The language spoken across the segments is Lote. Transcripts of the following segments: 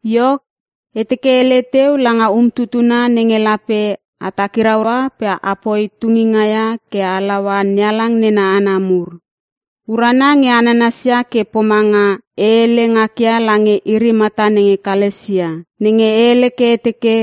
Iok, e teke e hele teu langa um tutuna nenge lape a takiraua pe apoi tunginga ia ke a halaua NeHalang nena hana mur. Urana nge a nanasia ke pomanga e hele ngakia lange iri mata nenge Kalasia. Nenge e hele ke e teke;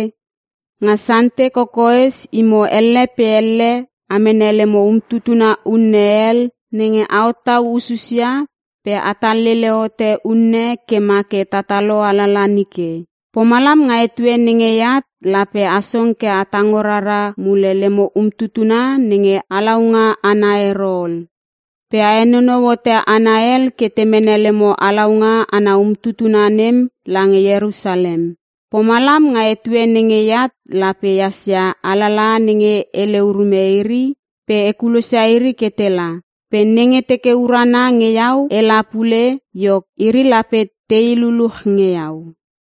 Nga Sante kokoes imo elle pe elle a mene lemo umtutuna unne hel nenge a hottau ususia pe atal lele hote unne ke ma ke tatalo alala nike. Pomalam nga etue nenge eat lape a song ke a tango rara mule lemo umtutuna nenge halaunga ana ero ol. Pe a henonou hote hana hel ke te mene lemo halaunga ana umtutuna nem lange Ierusalem. Pomalam nga etue nenge eat lape ehas ia alalaha nenge hele urume iri pe e kulosia iri ke tela. Pe nenge teke urana nge iau ela pule, iok iri lape tei luluch nge iau.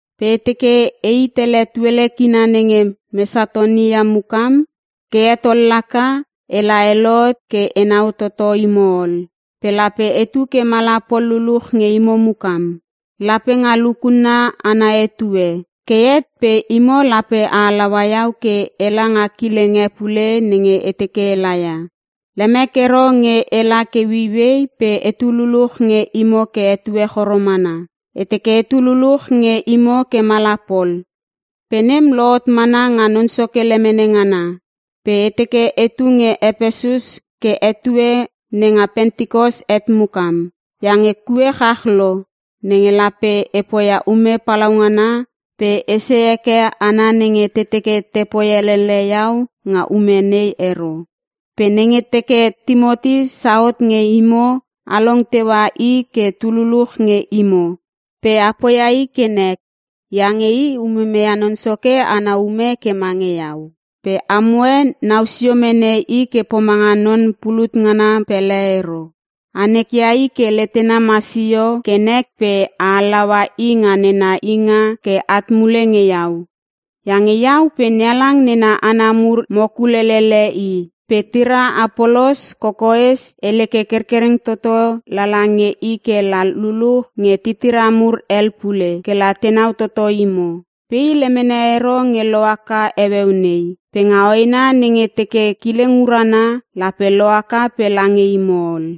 Pe e teke ei tele tuele kina nenge Mesatonia mukam ke het ol laka, ela e lohot ke enau toto imo ol. Pe lape etu ke mala pol luluch nge imo mukam. Lape nga lukunna ana etue. Ke het pe imo lape a halaua iau ke ela nga kileng e pule nenge e teke ela ia. Lemek ero nge ela ke ueiuei pe etu luluch nge imo ke etue choro mana. E teke etu luluch nge imo ke mala pol, pe nem lohot mana nga Non Soke lemene ngana. Pe e teke etu nge Epesus ke etue nenga Pentikos het mukam. Iange kue chach lo nenge lape e poia ume palaungana pe esei heke hana nenge te teke tepoi elele iau nga ume nei ero. Pe nenge teke Timoti sauhot nge imo along teua i ke tululuch nge imo pe a poia i ke nek, iange i umume ia Non Soke ana ume ke mange iau. Pe amoe nau sio mene i ke pomanga non pulut ngana pele ero. A nekia i ke letena masio ke nek pe a halaua i nga nena inga ke at mule nge iau; iange iau pe NeHalang nena hana mur mo kulelele i. Pe tira Apolos, kokoes e hele ke kerkereng toto lala nge i ke la luluch nge titira mur hel pule ke la tenau toto imo. Pe i lemene ero nge lohaka heueu nei, pe nga hoena nenge teke kileng urana lape lohaka pe lange imo ol.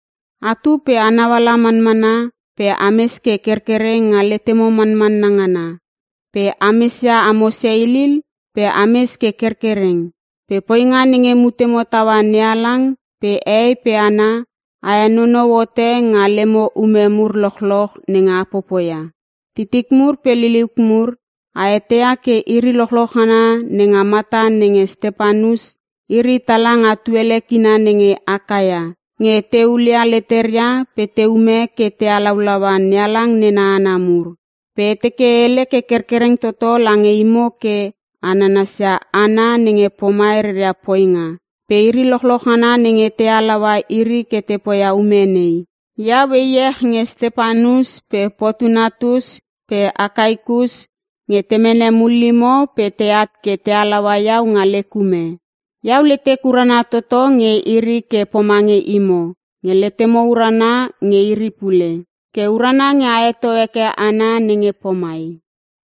Atu pe a nauala manmana pe ames ke kerkereng nga letemo manmanna ngana pe ames ia amo seilil pe a mes ke kerkereng. Pe poinga nenge mutemo taua NeHalang pe hehei pe hana, a henonou hote nga lemo ume mur lochloch nenge a popoia. Titik mur pe liliuk mur, a eteia ke iri lochloch ngana nenga mata nenge Stepanus, iri tala nga tuele kina nenge Akaia nge te hulia leteria pe te ume ke te halaulaua NeHalang nena hana mur. Pe e teke e hele ke kerkereng toto lange imo ke a nanasia hana nenge pomai reria poinga pe iri lochloch ngana nenge te halaua iri ke te poia ume nei. Iau e iech nge Stepanus pe Potunatus pe Akaikus nge te mene mullimo pe teat ke te halaua iau nga lek ume. Iau letek urana toto nge iri ke pomange imo nge letemo urana nge iri pule. Ke urana nge a heto heke hana nenge pomai.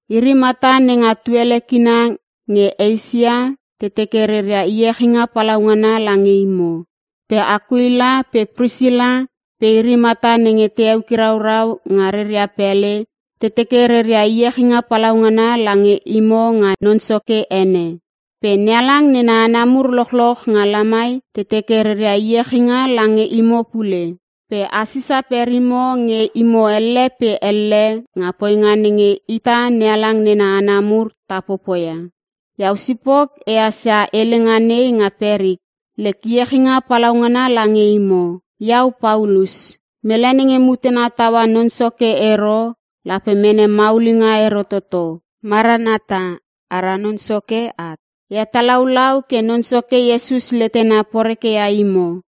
Iri mata nenga tuele kina nge Eisia te teke reria iechinga palaungana lange imo. Pe Akuila pe Prisila pe iri mata nenge te eukiraurau nga reria pele, te teke reria iechinga palaungana lange imo nga Non Soke ene. Pe NeHalang nena hana mur lochloch nga lamai, te teke reria iechinga lange imo pule. Pe a sisa perimo nge imo elle pe elle nga poinga nenge ita NeHalang nena hana mur ta popoia. Iau sipok e hassia helenga nei nga perik: Lek iechinga palaungana lange imo. Iau Paulus. Mele nenge mutena taua Non Soke ero lape mene maulinga ero toto. Maranata - Ara Non Soke at. E hetalaulau ke Non Soke Iesus letena poreke ia imo.